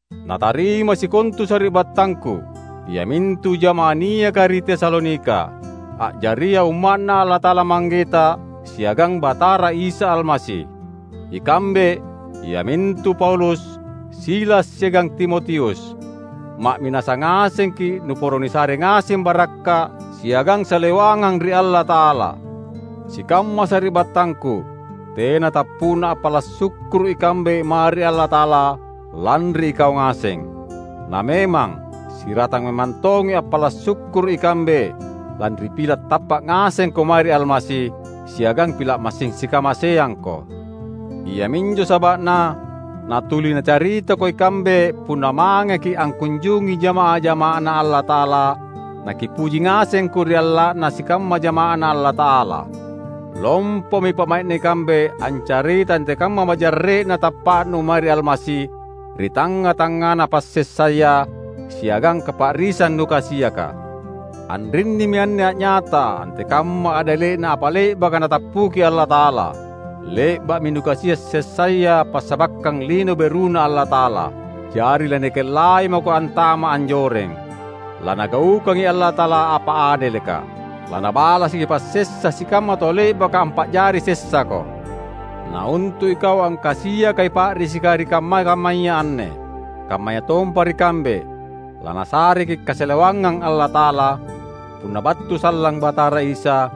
Natarimai sikontu sari’battangku, iamintu jama’ah niaka ri Tesalonika, a’jaria Umma’Na Allata’ala Manggeta siagang Batara Isa Almasi! Ikambe, iamintu Paulus, Silas siagang Timotius, ma’minasa ngasengki’ nuporo nisare ngaseng barakka’ siagang salewangang ri Allata’ala. Sikamma sari’battangku; tena tappu’na appala’ sukkuru’ ikambe mae ri Allata’ala lanri ikau ngaseng. Na memang, siratang memang tongi appala’ sukkuru’ ikambe, lanri pila’ tappa’ ngasengko mae ri Almasi, siagang pila’ massing sikamaseangko. Iaminjo saba’na natuli nacaritako ikambe punna mangeki’ akkunjungi jama’ah-jama’aNa Allata’ala nakipuji ngasengko ri alla’na sikamma jama’aNa Allata’ala. Lompomi pa’mai’na ikambe ancaritai antekamma majarre’na tappa’nu mae ri Almasi ri tangnga-tangngana passessaya siagang kapa’risang nukasiaka. Anrinnimi anne a’nyata antekamma adele’na apa le’baka Natappuki Allata’ala; Le’ba’mi nukasia’ sessaya passabakkang Lino BeruNa Allata’ala, jari lanikellai mako antama’ anjoreng. LaNagaukangi Allata’ala apa adeleka. LaNabalasaki passessa sikamma tau le’baka ampa’jari sessako. Na untu’ ikau angkasiakai pa’risika ri kamma-kammaya anne — kammayatompa ri kambe — laNasareki’ kasalewangang Allata’ala, punna battu sallang Batara Isa,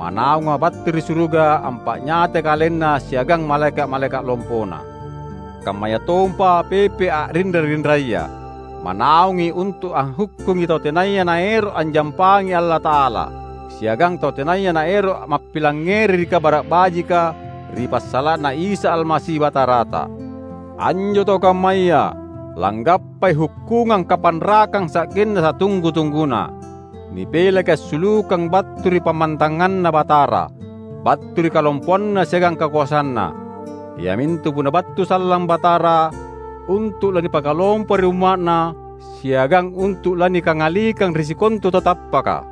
manaunga battu ri suruga ampa’nyatai KalenNa siagang malaeka’-malaeka’ lompoNa kammayatompa pepe’ a’rinra-rinraya. Manaungi untu’ anghukkungi tau tenaya naero’ anjampangi Allata’ala, siagang tau tenaya naero’ mappilangngeri ri Kabara’ Bajika ri passala’na Isa Almasi Batarata. Anjo tau kammaya langgappai hukkungang kapanrakang sa’genna satunggu-tungguna; nipelaki assulukang battu ri pammantanganNa Batara, battu ri kalompoanNa siagang kakoasanNa, iamintu punna battu sallang Batara untu’ lanipakalompo ri umma’Na siagang untu’ lanikangalikang ri sikontu tau tappaka.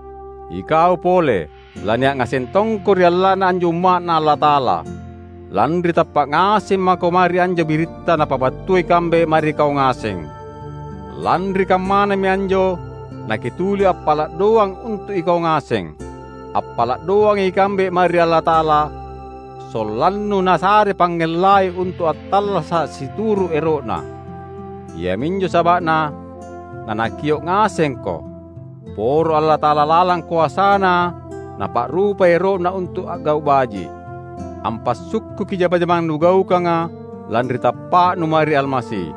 Ikau pole, lania’ ngaseng tongko ri alla’na anjo umma’Na Allata’ala, lanri tappa’ ngaseng mako mae ri anjo biritta napabattua ikambe mae ri kau ngaseng. Lanri kammanami anjo nakituli appala’ doang untu’ ikau ngaseng. Appala’ doangi ikambe mae ri Allata’ala, sollannu Nasare pangngellai untu’ attallasa’ situru’ ero’Na; iaminjo saba’Na naNakio’ ngasengko. Poro Allata’ala lalang koasaNa Napa’rupai ero’Na untu’ a’gau’ baji’, ampassukkuki jama-jamang nugaukanga lanri tappa’nu mae ri Almasi.